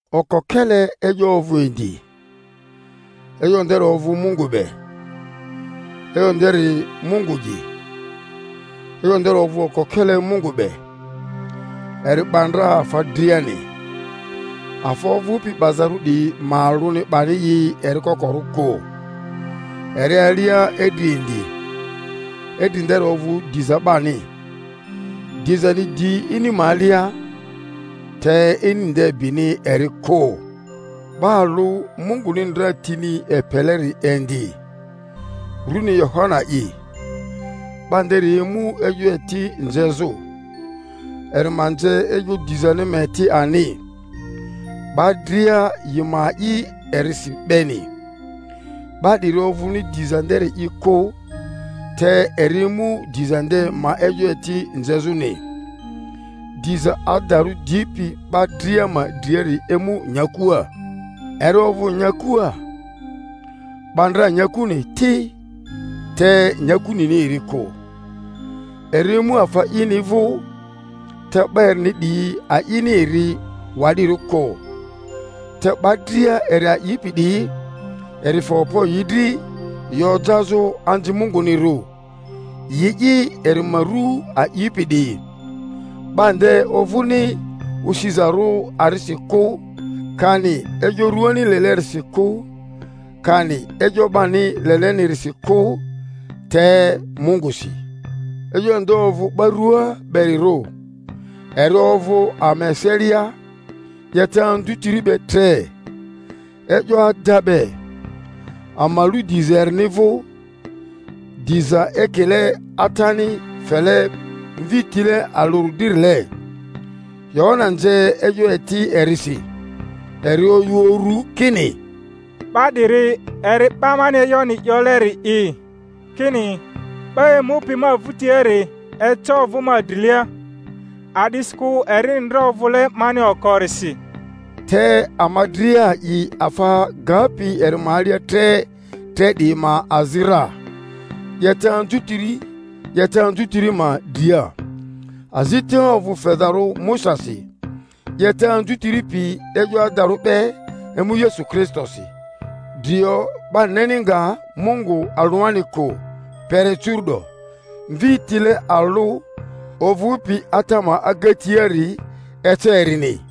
Okokele E'yo ovᴜ indi, E'yo nderi ovᴜ Mungu be, E'yo nderi Mungu'i. E'yo nderi ovᴜ oko-kele Mungu be; eri 'ba ndra afa driani, afa ovᴜpi 'bazarᴜ 'diyi ma alᴜni 'bani i eri kokorᴜ kᴜ. Eri alia idri indi, idri nderi ovᴜ diza 'bani. Dizani di ini ma alia, te ini nde bini eri kᴜ. 'Ba alᴜ Munguni ndra tini epeleri indi, runi Yohana'i. 'Ba nderi emu e'yo eti nzezᴜ, eri ma nze e'yo dizani ma eti ani, 'ba dria yi ma a'i erisi beni. 'Ba 'diri ovᴜni diza nderi'i kᴜ, te eri emu diza nde ma e'yo eti nzezᴜni. Diza adarᴜ dipi 'ba dria ma driari emu nyakua. Eri ovᴜ nyakua, 'ba ndra nyakuni ti, te nyaku nini eri kᴜ. Eri emu afa ini vᴜ, te 'ba erini 'diyi a'ini eri wa'dirᴜ kᴜ. Te 'ba dria eri a'ipi 'diyi, eri fe okpo yi dri yi ojazᴜ anzi Mungunirᴜ, yi'i eri ma ru a'ipi 'diyi; 'ba nde ovᴜni osizarᴜ arisi kᴜ, kani e'yo rᴜani lelerisi kᴜ, kani e'yo 'bani lelenirisi kᴜ, te Mungᴜsi. E'yo nde ofᴜ 'ba rua berirᴜ, eri ovᴜ ama eselia, 'yeta anzutiri be tre, e'yo ada be; ama lu diza erini vᴜ, diza ekile Atani fele Mvi tile alᴜri dririle. Yohana nze e'yo eti erisi, eri oyᴜ urᴜ kini, 'Ba 'diri eri 'ba mani e'yoni 'yoleri'i kini, 'Ba emupi ma vᴜtiari eca ovᴜ ma drilia, a'disikᴜ erini ndra ovᴜle mani okorisi.) Te ama dria a'i afa gapi eri ma alia tre tre 'diyi ma azi ra, 'yeta anzutiri 'yeta anzutiri ma dria. Azita ovᴜ fezarᴜ Musasi; 'yeta anzutiri pi e'yo adarᴜ be emu Yesu Kristosi. Drio 'ba neni nga Mungu alᴜani kᴜ kpere curu’do; Mvi tile alᴜ ovᴜpi Ata ma agatiari ece erini.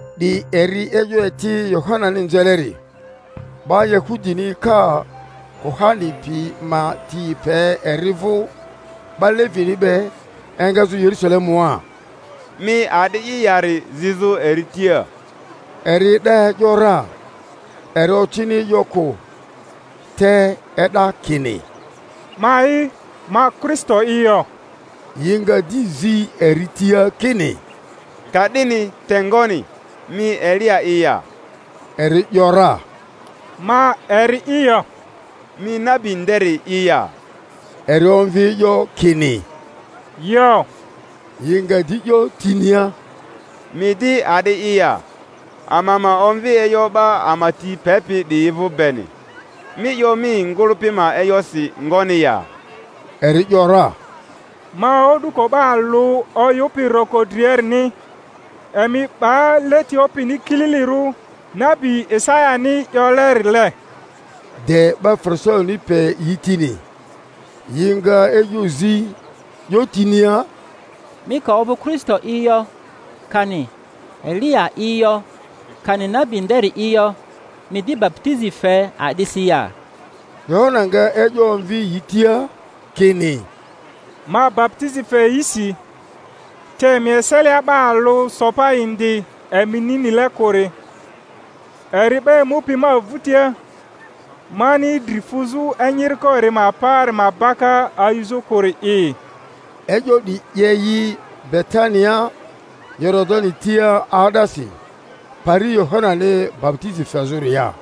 'Di eri e'yo eti Yohanani nzeleri, 'ba Yahudini ka kuhani piyi ma ti epe eri vᴜ 'ba Levini be, engazᴜ Yerusalemua, Mi a'di'i yari zizᴜ eri tia. Eri e'da e’yo ra, eri ocini e'yo kᴜ, te e'da kini, Ma'i, ma Kristo'i yo. Yi nga di zi eri tia kini, Ka'dini te ngoni? Mi Eliya'i ya? Eri ‘yora, Ma eri'i yo. Mi nabi nderi'i ya? Eri omvi e'yo kini, Yo. Yi nga di 'yo tinia, Mi di a'di'i ya? Ama ma omvi e'yo 'ba ama ti pepi 'diyi vᴜ beni. Mi 'yo mi ngᴜlᴜpi ma e'yosi ngoni ya? Eri ‘yora, Ma o'duko 'ba alᴜ oyᴜpi roko driarini, Emi 'ba leti Opini kililirᴜ, nabi Isayani 'yolerile. De 'ba Farisaini pe yi tini. Yi nga e'yo zi, 'yo tinia, Mi ka ovᴜ Kristo'i yo, kani Eliya'i yo, kani nabi nderi'i yo, mi di baputizi fe a'disi ya? Yohana nga e'yo omvi yi tia kini, Ma baputizi fe yisi; te emi eselia 'ba alᴜ so pa indi emini nile kᴜri; eri 'ba emupi ma vᴜtia, mani dri fuzᴜ enyiriko eri ma paari ma baka ayuzᴜ kᴜri'i. E'yo 'diyi 'ye yi Betania Yoridani tia 'aa'dasi, pari Yohanani baputizi fezᴜria.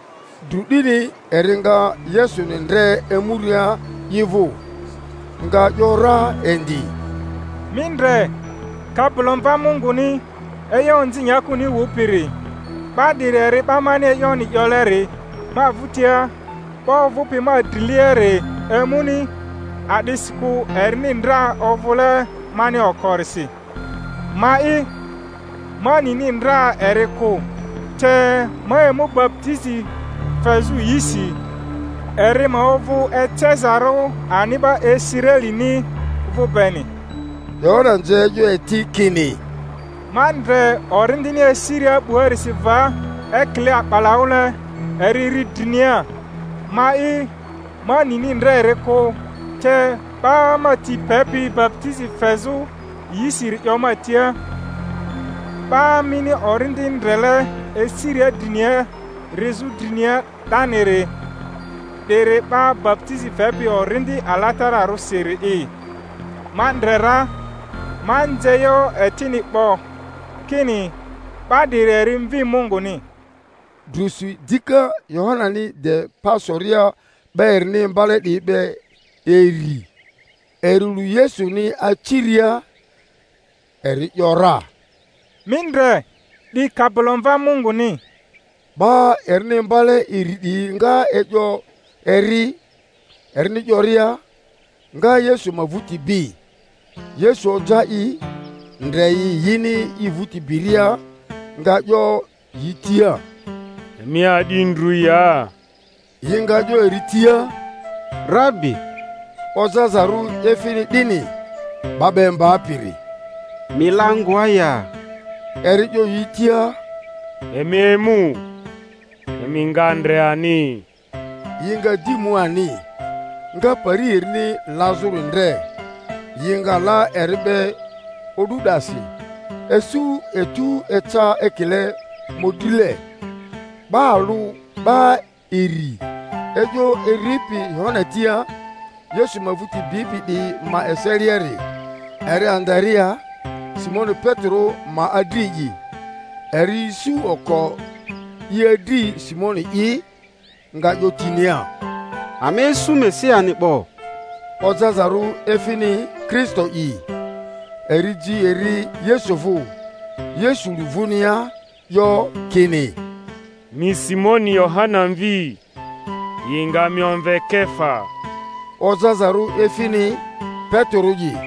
Drᴜ 'dini eri nga Yesuni ndre emuria i vᴜ, nga 'yo ra indi, Mi ndre, Kabilomva Munguni, e'yo onzi nyakuni wupiri! 'Ba 'diri eri 'ba mani e'yoni 'yoleri, Ma vᴜtia 'ba ovᴜpi ma driliari emuni, a'disikᴜ erini ndra ovᴜle mani okorisi. Ma'i, ma nini ndra eri kᴜ; te ma emu baputizi fezᴜ yisi, eri ma ovᴜ ecezarᴜ ani 'ba Israelini vᴜ beni. Yohana nze e'yo eti kini, Ma ndre Orindini esiria 'buarisi va ekile a'balaᴜle; eri ri drinia. Ma'i, ma nini ndra eri kᴜ; te 'ba ma ti pepi baputizi fezᴜ yisiri 'yo ma tia, 'Ba mini Orindi ndrele esiria drinia rizᴜ drinia 'daniri, 'diri 'ba baputizi fepi Orindi Alatararᴜsiri'i. Ma ndre ra, ma nze e'yo etini 'bo kini 'ba 'diri eri Mvi Munguni. Drusi dika Yohanani de pa soria 'ba erini imbale 'diyi be iri, eri lu Yesuni aciria, eri ‘yora, Mi ndre, 'di Kabilomva Munguni! 'Ba erini imbale iri 'diyi nga e'yo eri, erini 'yoria, nga Yesu ma vᴜti bi. Yesu oja i, ndre yi yini i vᴜti biria, nga 'yo yi tia, Emi a'di ndru ya? Yi nga 'yo eri tia, Rabi (ojazarᴜ efini 'dini, 'Ba 'ba Imbapiri), mi la ngoa ya? Eri 'yo yi tia, Emi emu, emi nga ndre ani. Yi nga di mu ani, nga pari erini lazᴜri ndre; yi nga la eri be o'du 'dasi; isu etu eca ekile mᴜdrile. 'Ba alᴜ 'ba iri e'yo eripi Yohana tia, Yesu ma vᴜti bipi 'diyi ma eseliari, eri Andarea, Simoni Petero ma adri'i. Eri isu oko i adri Simoni'i, nga 'yo tinia, Ama isu Mesiani 'bo (ojazarᴜ efini Kristo'i). Eri ji eri Yesu vᴜ. Yesu lu vᴜnia, 'yo kini, Mi Simoni Yohana mvi; yi nga mi omve Kefa (ojazarᴜ efini Petero'i).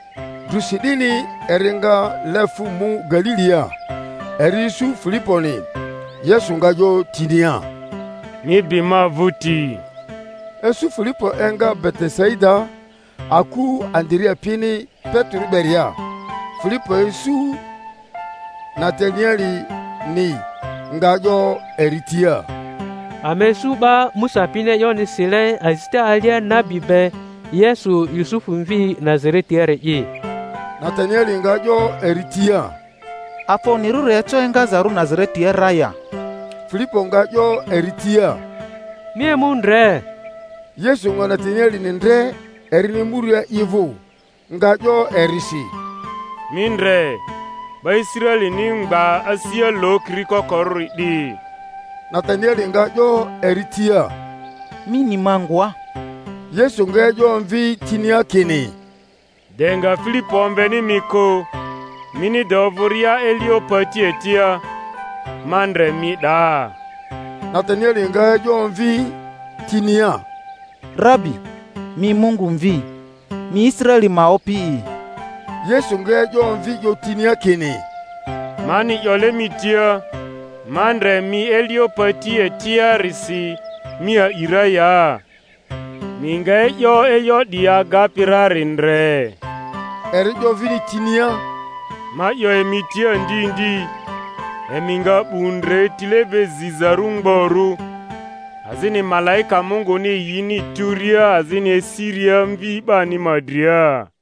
Drusi 'dini eri nga le fᴜ mu Galilia. Eri isu Filiponi; Yesu nga 'yo tinia, Mi bi ma vᴜti. Isu Filipo enga Betesaida, aku Andarea pini Petero beria. Filipo isu Natanielini, nga 'yo eri tia, Ama isu 'ba Musa pini e'yoni sile azita alia nabi be, Yesu Yusufu mvi Nazare-tiari'i. Natanieli nga 'yo eri tia, Afa onyirᴜri eco engazarᴜ Nazaretia ra ya? Filipo nga 'yo eri tia, Mi emu ndre. Yesu nga Natanielini ndre erini emuria i vᴜ, nga 'yo erisi, Mi ndre, 'ba Israelini mgba, asia lokiri kokorᴜri 'di! Natanieli nga 'yo eri tia, Mi ni ma ngoa? Yesu nga e'yo omvi tinia kini, De nga Filipo omveni mi kᴜ, mini de ovᴜria elio pati etia, ma ndre mi 'daa. Natanieli nga e'yo omvi tinia, Rabi, mi Mungu Mvi! Mi Israeli ma Opi'i! Yesu nga e'yo omvi 'yo tinia kini, Mani 'yole mi tia, Ma ndre mi elio pati etia-risi mi a'i ra ya? Mi nga e'yo e'yo 'diyi agapi rari ndre. Eri 'yo vini tinia, Ma 'yo emi tia ndi ndi, emi nga 'bu ndre tile be zizarᴜ mgborᴜ, azini malaika Munguni yini turia azini esiria Mvi 'bani ma dria.